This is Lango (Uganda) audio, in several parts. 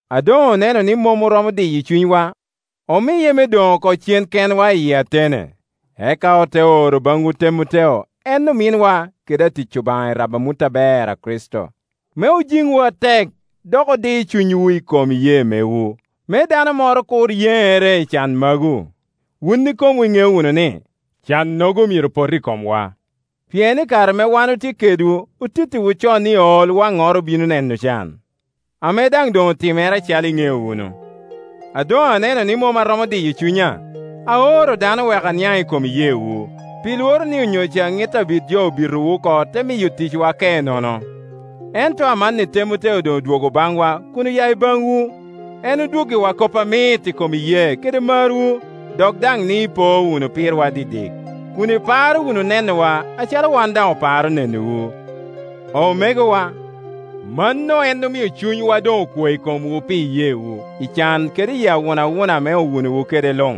A doŋ oneno ni mom oromo diyo cunywa, omiye me doŋ oko cen kenwa i Atene, eka ote oro baŋwu Temoteo, en ominwa kede atic Obaŋa i rabo amut aber a Kricito, me ojiŋwu atek dok odi cunywu i kom iyee mewu; me dano moro kur yeŋere i can magu. Wun ikomwu iŋeo wunu ni, cannogo myero pot i komwa. Pien i kare ame wan otye kedwu otittiwu con ni olwaŋnoro obino neno can, ame daŋ doŋ otimere acalo iŋeo wunu. A doŋ aneno ni mom aromo diyo cunya, aoro dano wek aniaŋ i kom iyeewu, pi Iworo ni onyo ca ŋit Abit jo obitowu oko te miyo ticwa ke nono. Ento amanni Temoteo doŋ odwogo baŋwa kun oya i baŋwu. En odwoggiwa kop amit i kom iyee kede marwu, dok daŋ ni ipo wunu pirwa didik, kun iparo wunu nenowa acalo wan daŋ oparo nenowu. Omegowa, mano en omio cunywa doŋ okwe i komwu pi iyeewu, i can kede i awunawuna ame owunowa kede luŋ;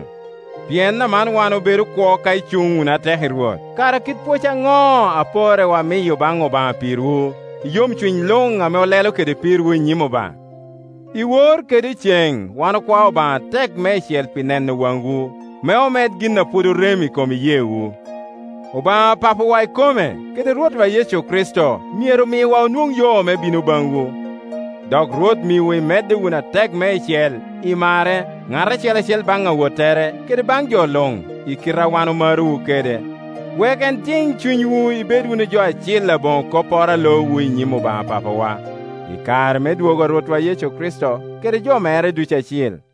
pien aman wan obedo kwo ka icuŋ wunu atek i Rwot. Kara kit pwoc aŋo a porrewa miyo baŋ Obaŋa pirwu, i yomcuny luŋ ame olelo kede pirwu i nyim Obaŋa? Iwor kede iceŋ wan okwao Obaŋa atek meicel pi neno waŋwu, me omed gin a pwod orem i kom iyee wu. Obaŋa Papawa ikome, kede Rwotwa Yecu Kricito, myero miwa onwoŋ yo me bino baŋwu. Dok Rwot miwu imedde wunu atek meicel i marre, ŋat acel acel baŋ awottere kede baŋ jo luŋ, i kite a wan omarowu kede, wek en jiŋ cunywu ibed wunu jo acil aboŋo kopporo a loowu i nyim Obaŋa Papawa, i kare me dwogo a Rwotwa Yecu kede jo mere ducu acil.